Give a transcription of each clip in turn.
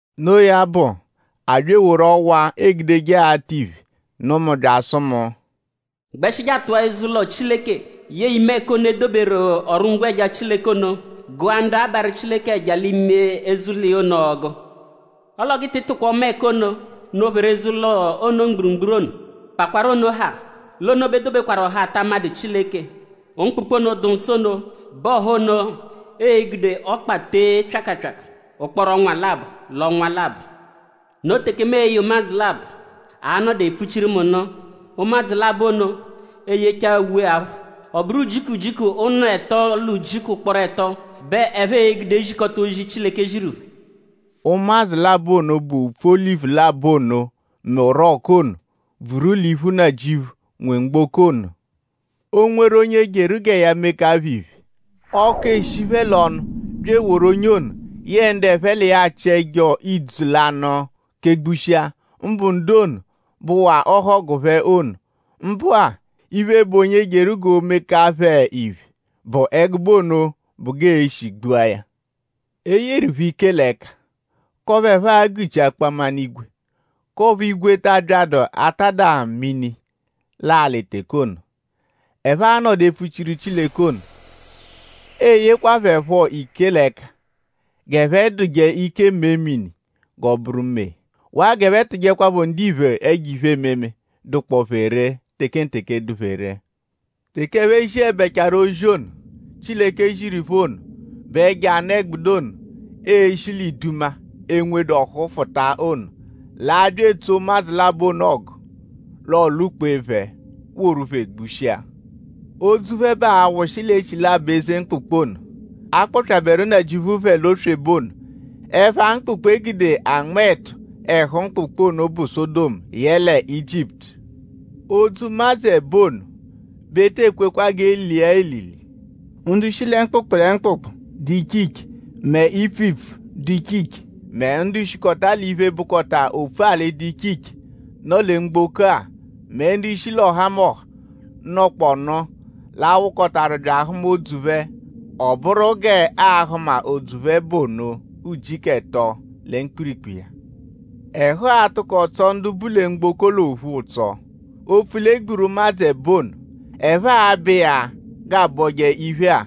Noo ya bụ; a bya eworu ọwa, eegudeje atụ iphe nụ mu bya asụ mu: “Gbẹshi je atụa eze-ụlo Chileke; yẹe ime ẹka ono, e doberu ọru-ngwẹja Chileke ono; gụa ndu abarụ Chileke ẹja l'ime eze-ụlo iya ono ọgu. Ọle ọ g'ị tị tụ̀kwà ọma ẹka ono, nọ-pheru eze-ụlo ono mgburugburu ono. Pakwarụ ono haa; l'ono bẹ e dobekwaru ọha, ata amadụ Chileke. Mkpụkpu ono, dụ nsọ ono bẹ ọha ono e-gude ọkpa tee pyakapyaka ụkporo ọnwa labọ l'ọnwa labọ. Noo teke mu e-ye ụmadzu labọ, a-nọdu epfuchiru mu nụ. Ụmadzu labọ ono e-yechaa uwe-aphụ. Ọ bụru ujiku ujiku ụnu ẹto l'ujiku ụkporo ẹto bẹ ẹphe e-gude zikọta ozi, Chileke ziru phẹ.” Ụmadzu labọ ono bụ upfu olivu labọ ono mẹ orọku ono, bvuru l'iphu Nnajịuphu, nwe mgboko ono. O -nweru onye jeru gẹ ya meka phẹ iphe; ọku eshi phẹ l'ọnu bya eworu onye ono yẹe ndu ẹphe l'iya achị ẹjo idzu lanụ kegbushia; mbụ ndu ono, bụwaa ọhogu phẹ ono. Mbụ-a; iphe, bụ onye jeru gẹ ya meka phẹ iphe bụ ẹgube ono bụ g'ee-shi gbua ya. E yeru phẹ ike l'ẹka; k'ọphu ẹphe a-gụ-chi akpaminigwe; k'ọphu igwe ta abyadụ atada mini l'alị teke ono, ẹphe a-nọdu epfuchiru Chileke ono. E yekwa phẹ phọ ike l'ẹka g'ẹphe dụje ike mee mini g'ọo-bụru mee; waa g'ẹphe tụjekwapho ndiphe ẹjo iphe-ememe, dụkpoo phẹ ree tekenteke, dụ phẹ ree. Teke ẹphe ziẹbechaaru ozi ono, Chileke ziru phẹ ono bẹ ẹjo anụ-ẹgbudu ono, e-shi l'iduma, enwedu ọ́hú fụta ono l'a-bya etsoo ụmadzu labọ ono ọgu. L'ọolwu-kpee phẹ woru phẹ gbushia. Odzu phẹ bẹ a-wụshi l'echilabọ eze mkpụkpu ono, a kpọpyaberu Nnajịuphu phẹ l'oswebe ono. Ẹpha mkpụkpu, e gude anma ẹtu ẹhu mkpụkpu ono bụ Sọdomu yẹle Ijiputu. Odzu ụmadzu ẹbo ono bẹ e te ekwekwa g'e lia elili. Ndu shi lẹ mkpụkpu lẹ mkpụkpu, dụ iche iche; mẹ ipfu ipfu, dụ iche iche; mẹ ndu shikọta l'iphe, bụkota opfu-alị ndu dụ iche iche, nọ lẹ mgboko-a; mẹ ndu shi l'ọhamoha, nọkpoonu l'a-wụkotaru bya ahụma odzu phẹ. Ọ bụru g'aa-hụma odzu phẹ bụ ono ujiku ẹto lẹ mkpirikpu iya. Ẹhu atụko atsọ ndu bu lẹ mgboko l'ophu ụtso; opfu l'e gburu ụmadzu ẹbo ono. Ẹphe abọo ya g'aabọje iphe-a;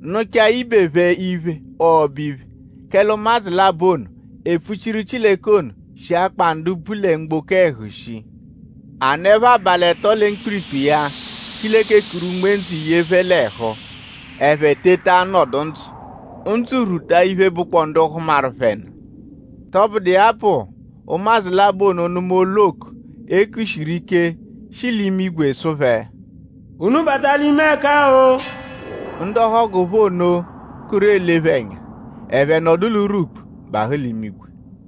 nụchaa ibe phẹ iphe ọbo-iphe; kẹle ụmadzu labọ ono, epfuchiru Chileke ono shi akpa ndu bu lẹ mgboko ẹhu shii. A nọepho abalị ẹto lẹ mkpirikpu iya Chileke kuru unme-ndzụ ye phẹ l'ẹhu; ẹphe teta nọdu ndzụ. Ndzụ rwuta iphe, bụkpoo ndu hụmaru phẹ nụ. Tọbudu iya bụ; ụmadzu labọ ono nụma olu oku, e kushiru ike, shi l'imigwe sụ phẹ: “Unu bata l'ime ẹka-o.” Ndu ọhogu phẹ ono kụru ele phẹ ẹnya; ẹphe nọdu l'urwukpu bahụ l'imigwe.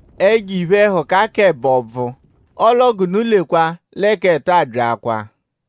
Ẹjo iphe-ẹhuka k'ẹbo bvụ. Ọle ọ g'unu lekwa lẹ k'ẹto abyaakwaa.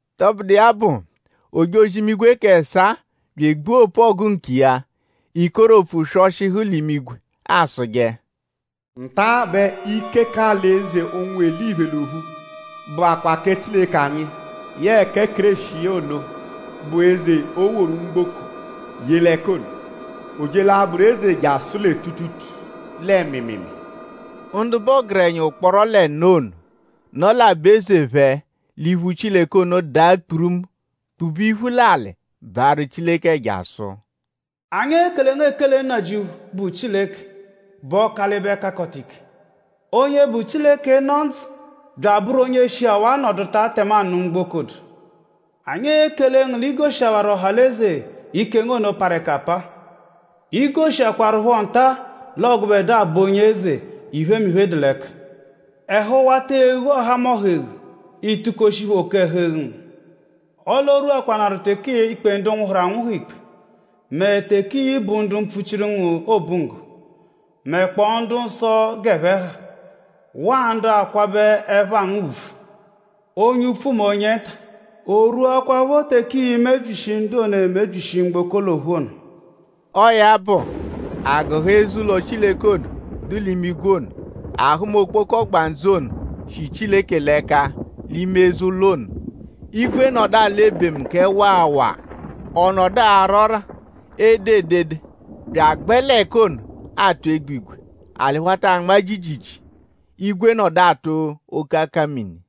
Tọbudu iya bụ; ojozi-imigwe k'ẹsaa bya egbua opu-ọgu nkiya. Ikeropfu swọshihu l'imigwe asụje: “Nta bẹ ike k'alị-eze ụnwu eliphe l'ophu bụakwa kẹ Chileke anyi yẹe kẹ Kéreshi iya ono, bụ eze, o woru mgboko ye l'ẹka ono. O je l'abụru eze jasụ lẹ tuutuutuu lẹ mịimiimii.” Ndu bụ ọgerenya ụkporo l'ẹno ono, nọ l'aba-eze phẹ l'iphu Chileke ono daa kpurumu kpube iphu l'alị baarụ Chileke ẹja; sụ: “Anyi ekele ngu ekele Nnajịuphu, bụ Chileke, bụ Ọkalibe-Kakọta-Ike. Onye bụ Chileke, nọ ndzụ bya abụru onye shihawaa nọduta tẹmanu mgboko dụ. Anyi ekele ngu l'i goshihawaru ọha l'eze ike ngu ono parụ ẹka apa. I goshiakwaruphọ nta-a l'ọo gụbedua bụ onye-eze, iphemiphe dụ l'ẹka. Ẹhu wata eghu ọhamoha eghu; ị tukoshi phẹ oke-ẹhu-eghu ngu. Ọle o rwuakwanaru teke ii-kpe ndu nwụhuru anwụhu ikpe; mẹ teke ii-bu ndu mpfuchiru ngu obunggo; mẹkpoo ndu-nsọ g'ẹphe ha; waa ndu akwabẹ ẹpha ngu ùbvù; onye upfu mẹ onye nta; o rwuakwaaphọ teke ii-mebyishi ndu ono, emebyishi mgboko l'ophu ono.” Ọo ya bụ; a gụhaa eze-ụlo Chileke ono, dụ l'imigwe ono. A hụma okpoko ọgbandzu ono, shi Chileke l'ẹka l'ime eze-ụlo ono. Igwe nọdu alọ ebemu kẹ waa waa; ọ nọdu ara ọ́rà; ede edede bya agbẹ l'ẹka ono atụ egbigwe. Alị wata anma jiijiijii. Igwe nọdu atụ oke akamini.